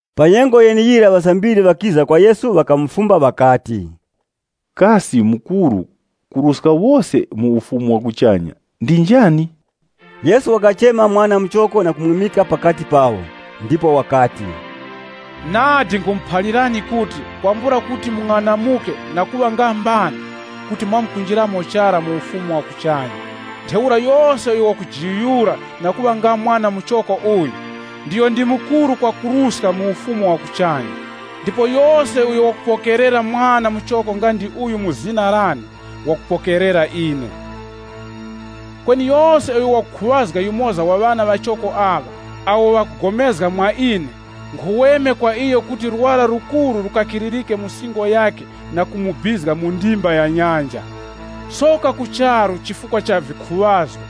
Pa nyengo yeneyira ŵasambiri ŵakiza kwa Yesu, ŵakamufumba ŵakati, “Kasi mukuru kuruska wose mu Ufumu wa kuchanya ndi njani?” Yesu wakachema mwana muchoko na kumwimika pakati pawo. Ndipo wakati, “Nadi nkhumuphalirani kuti kwambula kuti mung'anamuke na kuŵa nga mbana, kuti mwamkunjiramo chara mu Ufumu wa kuchanya. Ntheura yose uyo wakujiyuyura na kuŵa nga mwana muchoko uyu, ndiyo ndi mukuru kwakuruska mu Ufumu wa kuchanya. Ndipo yose uyo wakupokerera mwana muchoko nga ndi uyu mu zina lane, wakupokerera ine.” “Kweni yose uyo wakukhuŵazga yumoza wa ŵana ŵachoko aŵa, awo ŵakupulikana mwa ine, nkhuweme kwa iyo kuti lwara lukuru lukakiririke mu singo yakhe na kumubizga mu ndimba ya nyanja. Soka ku charu chifukwa cha vikhuŵazgo.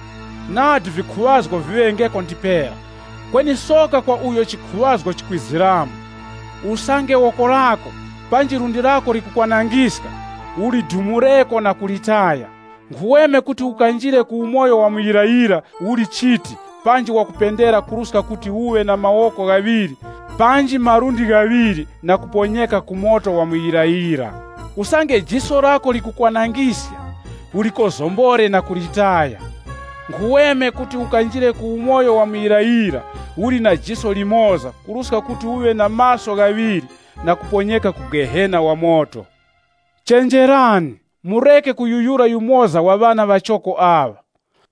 Nadi vikhuŵazgo viŵengeko ndipera, kweni soka kwa uyo chikhuŵazgo chikwiziramo. “Usange woko lako, panji lundi lako likukwanangiska, ulidumureko na kulitaya. Nkhuweme kuti ukanjire ku umoyo wa muyirayira uli chiti panji wakupendera kuruska kuti uŵe na mawoko ghaŵiri panji malundi ghaŵiri na kuponyeka ku moto wa muyirayira. Usange jiso lako likukwanangiska ulikozombore na kulitaya. Nkhuweme kuti ukanjire ku umoyo wa muyirayira uli na jiso limoza kuruska kuti uŵe na maso ghaŵiri na kuponyeka ku Gehena wa moto. “Chenjerani! Mureke kuyuyura yumoza wa ŵana ŵachoko aŵa.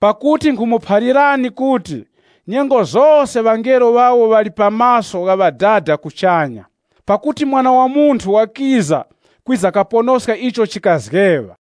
Pakuti nkhumuphalirani kuti, nyengo zose ŵangelo ŵawo ŵali pa maso gha Ŵadada kuchanya. [ Pakuti Mwana wa Munthu wakiza kwiza kaponoska icho chikazgeŵa.]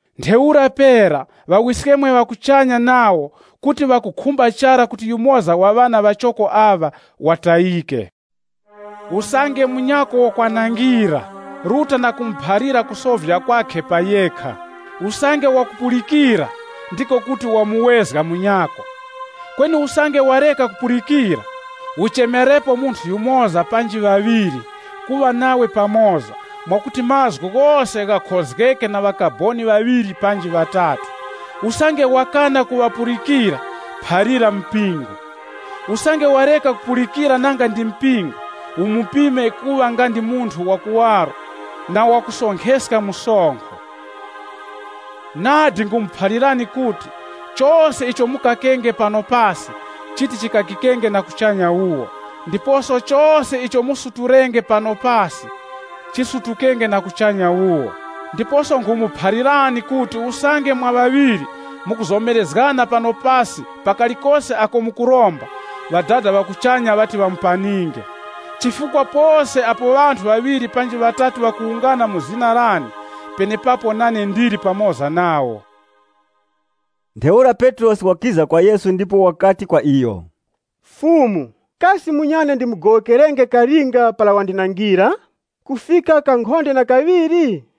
Ntheura pera, Ŵawiskemwe ŵa kuchanya nawo kuti ŵakukhumba chara kuti yumoza wa ŵana ŵachoko aŵa ŵatayike. “Usange munyako wakwanangira, ruta na kumuphalira kusovya kwakhe pa yekha. Usange wakupulikira, ndiko kuti wamuwezga munyako. Kweni usange wareka kukupulikira, uchemerepo munthu yumoza panji ŵaŵiri kuŵa nawe pamoza mwakuti mazgu ghose ghakhozgeke na ŵakaboni ŵaŵiri panji ŵatatu. Usange wakana kuŵapulikira, phalira mpingo. Usange wareka kupulikira nanga ndi mpingo, umupime kuŵa nga ndi munthu wakuwaro na wakusonkheska msonkho. “Nadi nkhumuphalirani kuti, chose icho mukakenge pano pasi, chiti chikakikenge na kuchanya wuwo, ndiposo chose icho musutulenge pano pasi, chamkusutulika na kuchanya wuwo. “Ndiposo nkhumuphalirani kuti usange mwa ŵaŵiri mukuzomerezgana pano pasi pa kalikose ako mukuromba, Ŵadada ŵa kuchanya ŵati ŵamupaninge. Chifukwa pose apo ŵanthu ŵaŵiri panji ŵatatu ŵawungana mu zina lane, penepapo nane ndili pamoza nawo.” Ntheura Petrosi wakiza kwa Yesu ndipo wakati kwa iyo, “Fumu, kasi munyane ndimugowokerenge kalinga para wandinangira? Kufika kankhonde na kaŵiri?”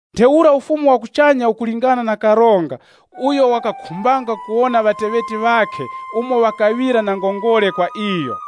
Ntheura Ufumu wa kuchanya ukulingana na karonga uyo wakakhumbanga kuwona ŵateŵeti ŵakhe umo ŵakaŵira na ngongole kwa iyo.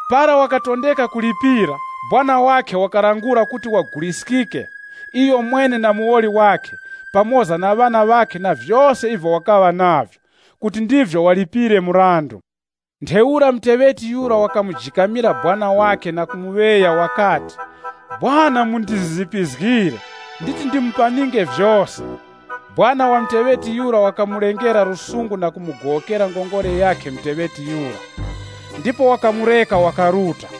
Para wakatondeka kulipira, sekuru wakhe wakalangula kuti waguliskike iyomwene na muwoli wakhe pamoza na ŵana ŵakhe na vyose ivyo wakaŵa navyo, kuti ndivyo walipire mrandu. Ntheura muteŵeti yura wakamujikamira sekuru wakhe na kumuŵeya wakati, ‘Sekuru mundizizipizgire, nditi ndimupaninge vyose.’ Sekuru wa muteŵeti yura wakaŵa na chiwuravi ndipo wakamugowokera ngongole yakhe muteŵeti yura, ndipo wakamureka wakaruta.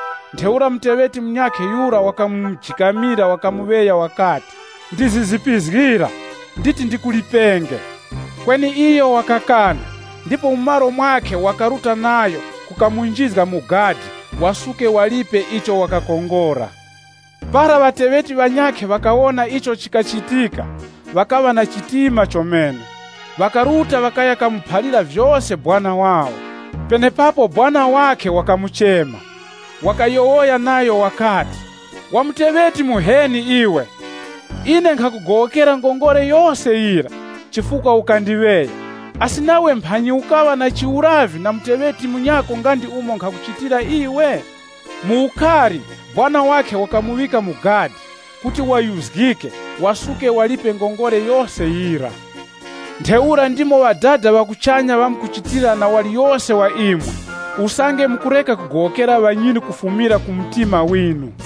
Ntheura muteŵeti munyakhe yura wakamujikamira wakamuŵeya wakati, ‘Ndizizipizgira. Nditi ndikulipenge.’ Kweni iyo wakakana ndipo mu malo mwakhe wakaruta nayo kukamunjizga mu gadi wasuke walipe icho wakakongora. Para ŵateŵeti ŵanyakhe ŵakawona icho chikachitika, ŵakaŵa na chitima chomene. Ŵakaruta ŵakaya kamuphalira vyose sekuru wawo. Penepapo sekuru wakhe wakamuchema, wakayowoya nayo wakati, ‘Wa muteŵeti muheni iwe! Ine nkhakugowokera ngongole yose yira, chifukwa ukandiŵeya. Asi nawe mphanyi ukaŵa na lusungu na muteŵeti munyako nga ndi umo nkhakuchitira iwe?’ Mu ukari, sekuru wakhe wakamuŵika mu gadi kuti wayuzgike wasuke walipe ngongole yose yira. “Ntheura ndimo Ŵadada ŵa kuchanya ŵamkuchitira na waliyose wa imwe, usange mukureka kugowokera ŵanyinu kufumira ku mtima winu.”